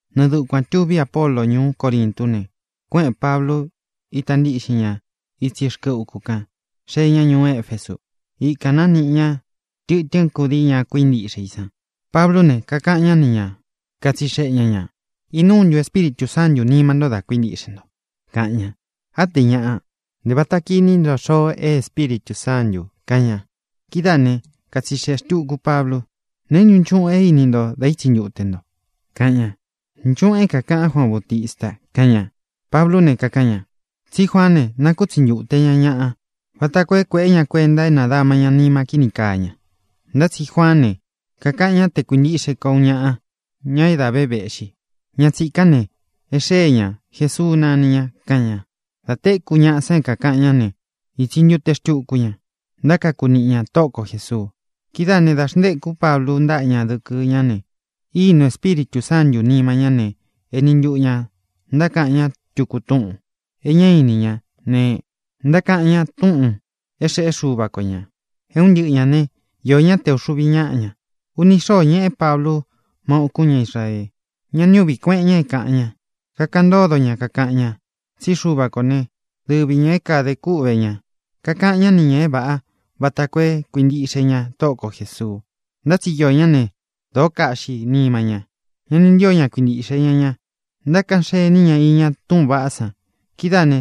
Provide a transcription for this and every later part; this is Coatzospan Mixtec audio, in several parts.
Nɨɨ dukuān tuví Apolo ñuú Corintú ne, kuéꞌēn Pablu, ita ntíꞌxin ña itsí rkɨ uku kan, xée ña ñuú Efesu. Ikān nániꞌi ña tɨtɨ́n kudii ña kuíntiꞌxe i san. Pablú ne, kakaꞌan ñá ni ña, katsixeꞌe ña ñā: —¿Inúu ntu Espíritū Sántū nima nto da kuíntiꞌxe nto? —kaꞌan ña. —Á te ñaꞌa. Ntē vata kiní ntɨ xoo é Espíritū Sántū —kaꞌan ña. Kidáā né, katsixeꞌē xtuku Pablu: —¿Neé ntu nchuꞌun e íni nto dá itsi ntute nto? —kaꞌan ña. —Nchuꞌūn é kākaꞌan Juaan Baútista —kaꞌan ña. Pablú ne, kakaꞌan ña: —Tsí Juaán ne, nákutsi ntūte ña ñaꞌa vata koo é kuēꞌé ña kuenta é nādama ña nima kíni kaa ña. Ntá tsi Juaán ne, kakaꞌan ñá te kuíntiꞌxe ko uun ñaꞌa, ña é dā ve véꞌxi. Ña tsīkán ne, e xée ñā. Jesuu nani ña —kaꞌan ña. Dā téku ñaꞌa san é kākaꞌan ñá ne, ītsi ntute xtuku ña, ntákaku niꞌi ña Tóꞌo ko Jēsuu. Kidáā né, dā xntékú Pablu ntáꞌa ña dɨkɨ ñá ne, ínūu Espíritū Sántū nima ñá ne, eni ntuꞌu ñā ntákaꞌan ñá tuku túꞌūn e ñá ini ñá ne, ntákaꞌan ñá túꞌūn é xeꞌé Xuva ko ñā. É un ntɨꞌɨ ñā ne, iō ñá te ūxuvi ñáꞌa ña. Uni xóo ñeꞌé Pablu má ūkún ña Israee. Ñá ni uꞌvī kueꞌen ña é kāꞌan ña. Kakaꞌan ntódo ña, kakaꞌan ña tsí Xuva kō né, dɨvi ñā é kadē kúꞌvē ña. Kakaꞌan ñá ni ñā é vāꞌá vata koo é kuīntiꞌxe ña Tóꞌo ko Jēsuu. Ntá tsi iō ñá ne, dōó kaꞌxi nima ña. Ña ni ntío ña kuintīꞌxe ña ña. Ntákaꞌan xení ña iña túꞌūn vaꞌá san. Kidáā ne,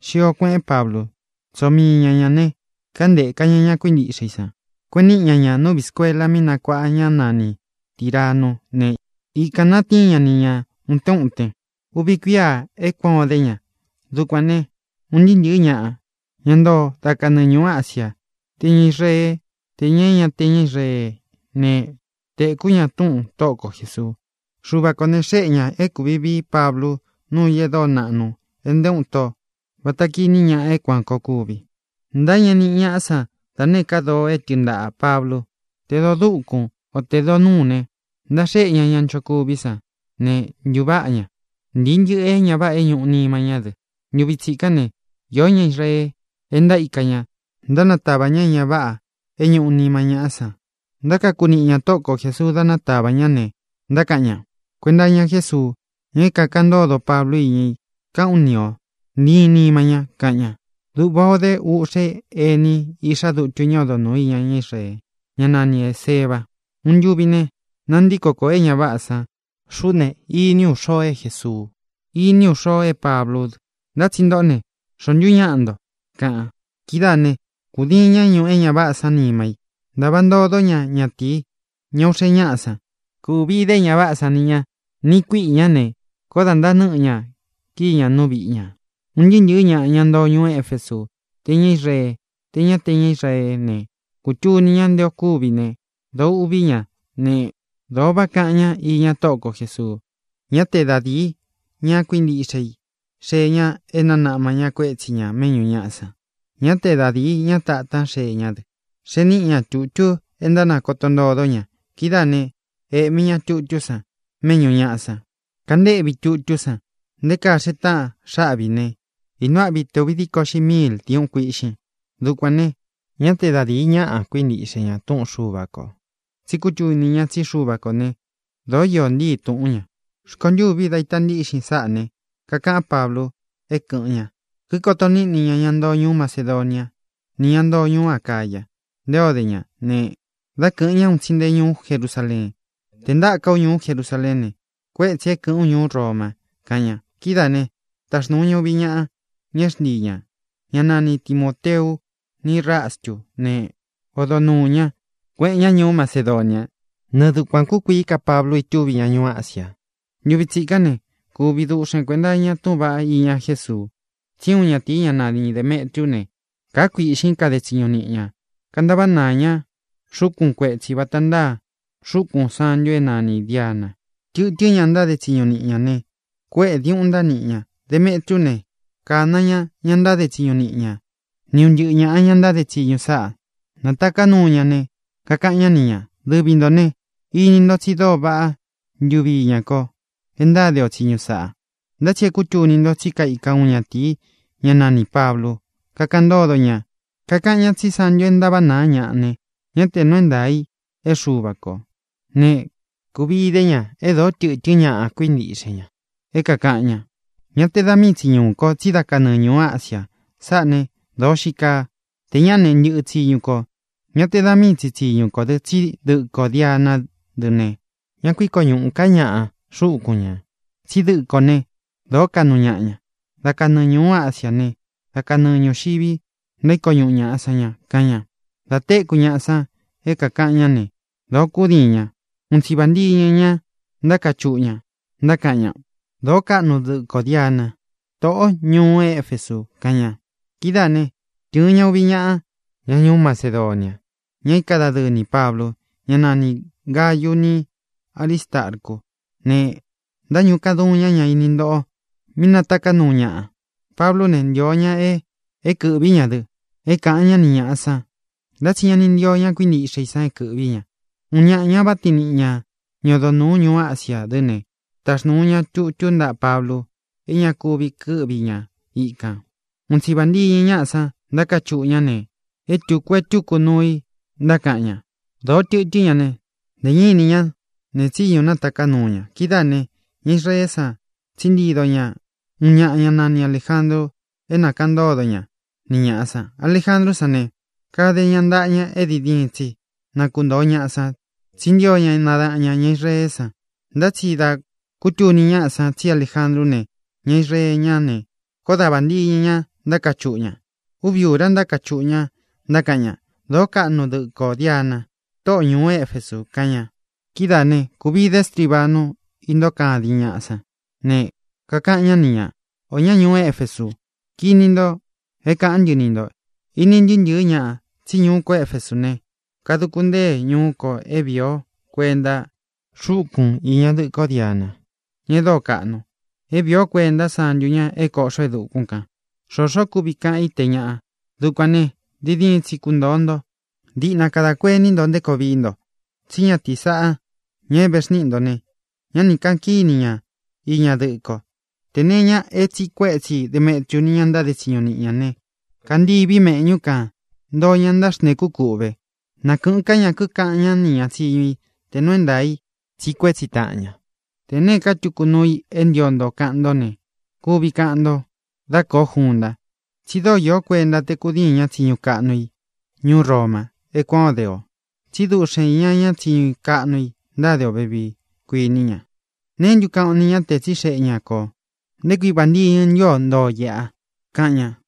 xio kueꞌén Pablu, tsóo mii ña ña ne, kántēka ña ña kuíntiꞌxe i san, kueꞌen niꞌi ña ña nú viꞌī skuela mí nakuāꞌa ñá nani Tīranú ne, ikān natíin ña ni ñā utén uten. Uvi kuíā é kuān o dé ña. Dukuān ne, un ntɨɨ́ ntɨ̄ɨ́ ñaꞌa, ña ntoo da kanɨɨ ñūú Asia, tē ña Israeé, tē ña é ña te ña Israeé ne, tēkú ña túꞌūn Tóꞌo ko Jēsuu. Xuva kō ne, xéꞌe ñā é kūvi vií Pablu nuu i e dóo naꞌnu é nté uun ito vata kiní ñaꞌa é kuān koo kúvi. Ntáñeꞌe niꞌi ñaꞌá san da nēé ka doo é tɨɨn ntaꞌā Pablu, te doo dúkūn, o tē doo núu ne, ntáxéꞌe ña ña nchokuví san ne, ntuváꞌa ña. Ntīi ntɨꞌɨ é ña váꞌā é ñūꞌu nima ñá dɨ. Ntuvi tsikán ne, iō ñá Israee é ntaíka ña, ntánatava ña é ña váꞌā é ñūꞌu nima ñáꞌa san. Ntákaku niꞌi ña Tóꞌo ko Jēsuu dá natavā ñá ne, ntákaꞌan ña: —Kuenta iña Jésuu, ña é kākaꞌan ntódo Pablu íña i, kaꞌán u ni ō: ¡Ntíin nīma ña! —kaꞌan ña. Duꞌva ō dé uꞌxe éni, iꞌxá dutu ñá odo nūu iña ñá Israee, ñá nani Ēseva. Uun ntuvi ne, nantíko kōo é ña váꞌā san: —Xuꞌú ne, iní u xoo e Jésuu. Iní u xoo é Pablú dɨ. Ntá tsi ntoꞌó ne, ¿xóo ntu ñaꞌa nto? —kaꞌan. Kidáā ne, kūdiin ñá ñuꞌu é ña váꞌā san nima í, ntāva ntodó ña ñatīí, ña uꞌxe ñáꞌa san. Kūvi dé e ña váꞌā sán ni ñā niꞌi kuíꞌī ñá ne, koó dā ntántɨɨ́ ña kíi ña nú viꞌi ñā. Un ntɨɨ́ ntɨ̄ɨ́ ñaꞌa, ña ntoo ñuú Efesú, tē ña Israeé, tē ña é ña te ña Israeé ne, kūtuni ñá nte o kúvi ne, dōo uꞌví ña ne, dōo váꞌa kaꞌan ñá iña Tóꞌo ko Jēsuu. Ñá te da dīi ña kuíntiꞌxe i xee ña é nānaꞌma ña kuétsi ña mēꞌñú ñaꞌa san. Ñá te da dīi ñá tātán xee ñá dɨ. Xee níꞌi ña tutu é ntánakoto ntodó ña. Kidáā né, ēꞌmi ña tutú san méꞌñū ñaꞌa san. Kántēꞌví tutú san nté kaa xee táꞌan xáꞌvi ī ne, ínūu áꞌvi te ūvi díko uꞌxi miil diuꞌun kuíꞌxin. Dukuān ne, ñá te da dīi ñaꞌa kuintíꞌxe ña túꞌun Xuva kō, tsi kútuni ña tsí Xuva kō né, dōó iō ntíi tūꞌún ña. Rkontûví dá ita ntíꞌxin sáꞌā ne, kakaꞌán Pablu é kɨ̄ꞌɨn ña, kikoto niꞌní ña ña ntoo ñuú Macedonia ni ñá ntoo ñuú Acaya nté o de ña ne, dá kɨ̄ꞌɨn ña un tsi nte ñuú Jerusaleen. —Tē ntáka ú ñuú Jerusaleén ne, kuétsī é kɨ̄ꞌɨ́n u ñuú Roma —kaꞌan ña. Kidáā ne, táxnūu ña uvi ñaꞌa, ña é xntii ñā, ñá nani Timōteu ni Rastú ne, odo nuū ñá, kueꞌen ña ñuú Macedonia. Nɨɨ dukuān kúkuií ka Pablu itúvi ña ñuú Asia. Ntuvi tsikán ne, kuvi duꞌxen kuēnta iña túꞌūn vaꞌá iña Jésuu. Tsí uun ñatīi, ñá nani Dēmetriú ne, kāá kuīꞌxín kade tsiñu niꞌi ña, kantaváꞌa naa ña xúkun kuetsī vata ntáa xúkūn santu é nanī Diana. Tɨtɨ́n ñaꞌa ntáde tsiñu niꞌi ñā ne, kuéꞌē diuꞌun ntániꞌi ña. Demetriú ne, kāna ña ña ntáde tsiñu niꞌi ña ni un ntɨꞌɨ ñāꞌa, ña ntáde tsiñu sáꞌa. Nātaká nuu ña ne, kakaꞌan ñá ni ñā: —Dɨvi ntō ne, ini ntó tsi dóo vaꞌá ntuvi iña ko é ntáde o tsiñu sāꞌa. Ntá tsi é kūtuni nto tsí kaika uun ñatīi, ñá nanī Pablu, kakáꞌan ntódo ña, kakaꞌan ñá tsi santu é ntaváꞌa nāá ñaꞌa ne, ñá tē nuu é ntaa ī é Xuva kō. Ne, kūvi idé ña e dóo tɨtɨ́n ñaꞌa kuíntiꞌxe ña é kākaꞌan ña. Ñá te da mii tsi ñuū ko, tsí da kanɨɨ ñūú Asia. Sáꞌā né, dōo xii kaa; tē ñaꞌá ne, ntɨꞌɨ tsiñu kō. Ñá te da mii tsi tsiñu kō dɨ́, tsí dɨꞌɨ kō Dianá dɨ ne, ñá kuiko ñuꞌū ká ñaꞌa xúkun ñā. Tsí dɨꞌɨ kō né, dōó kaꞌnu ñaꞌa ña. Da kanɨɨ ñūú Asiá ne, da kanɨɨ ñūxivi ntaíko ñuꞌu ñāꞌa san ña —kaꞌan ña. Dā téku ñaꞌa san é kākaꞌan ñá ne, dōo kúdiin ña. Un tsi vāntiñɨ ña ntákachuꞌu ña, ntákaꞌan ña: —¡Dōo kaꞌnu dɨ́ꞌɨ kō Diana, tóꞌo ñūú Efesu! —kaꞌan ña. Kidáā né, tɨ̄ɨn ña uvi ñaꞌa, ña ñuú Macedonia, ña íka dadɨɨ nī Pablu, ñá nanī Gayu ni Áristarcú ne, ntaíñuꞌu kaduun ña ña ini ntoꞌo mí nátaká nuu ñaꞌa. Pablú ne, ntio ña é kɨ̄ꞌvi ña dɨ é kāꞌan ñá ni ñāꞌa san, ntá tsi ña ni ntío ña kuíntiꞌxe i san é kɨ̄ꞌvi ña. Uun ñaꞌa ña váꞌa tiin niꞌi ña, ña odo nūu ñuú Asia dɨ́ ne, táxnūu ña tutú ntaꞌa Pablu é ña ku kɨ́ꞌvi ña íkān. Un tsi vāntiñɨ ñáꞌa san, ntákachuꞌu ña ne, é tūku e túku nuu i ntákaꞌan ña. Dōo tɨtɨ́n ña ne, ntē ñá ini ña nee tsíñu nátaká nuu ña. Kidáā ne, ña Israeé san tsíꞌi ntido ñá uun ñaꞌa, ñá nani Alējandru, é na kāꞌan ntódo ña ni ñāꞌa san. Alejandrú san ne, kade ña ntaꞌa ña é diin diin tsi na kuntōo ñaꞌa san, tsí ntio ña nadaꞌan ñā ña Israeé san. Ntá tsi dā kútuni ñáꞌa san tsí Alejandrú ne, ña Israee ñá ne, koó da vāntiñɨ ña ntákachuꞌu ña. Úvi ūra ntákachuꞌu ña, ntákaꞌan ña: —¡Dōo kaꞌnu dɨ́ꞌɨ kō Diana, tóꞌo ñūú Efesu! —kaꞌan ña. Kidáā né, kūvi dé strivanu, intóo kadin ñáꞌa san. Ne, kakaꞌan ñá ni ñā: —Ō ñá ñuú Efesu, kini nto é kāꞌán ntɨ ni ntō. Ini ntɨɨ́ ntɨ̄ɨ́ ñaꞌa tsí ñuu ko Éfesú ne, kaduku ntée ñuu ko é viī ó kuenta xúkun īña dɨꞌɨ kó Diana, ña é dóo kaꞌnu, é viī ó kuenta sántu ña é kōꞌxó e dukún kān. Xōxó kuvi kaꞌan i te ñáꞌa. Dukuān né, diin diin tsi kuntōo nto. Diꞌna kada kuení nto nté koo vií nto. Tsí ñatīí sāꞌa, ña é vēxníꞌi ntō ne, ñá ni kāꞌan kíni ña iña dɨꞌɨ ko. Tē nee iña é tsīꞌi kuétsi Demetriu ni ña ntáde tsiñu niꞌi ña ne, kantií viꞌi meꞌñú kān; ntoo ña ntáxntēkú kūꞌve. Na kɨ̄ꞌɨ́n ka ña, kikaꞌan ñá nī ña tsiñu i te nēé nuu i tsiꞌi kuétsi taꞌan ña. Tē neé ka tuku nuu i é ntio nto kaꞌan ntó ne, kuvi kaꞌan nto dá kōo junta. Tsi dóo īó kuenta te kūdiin ña tsiñu kaꞌnu i ñuú Roma é kuān ó de ō. Tsí duꞌxen iña ña tsiñu kaꞌnu i ntáde ō vevii, kuiní ña. ¿Neé ntu kaꞌan o ni ña te tsixeꞌe ña kō nté kui vāntiñɨ ntu o ntóo ō iꞌa? —kaꞌan ña.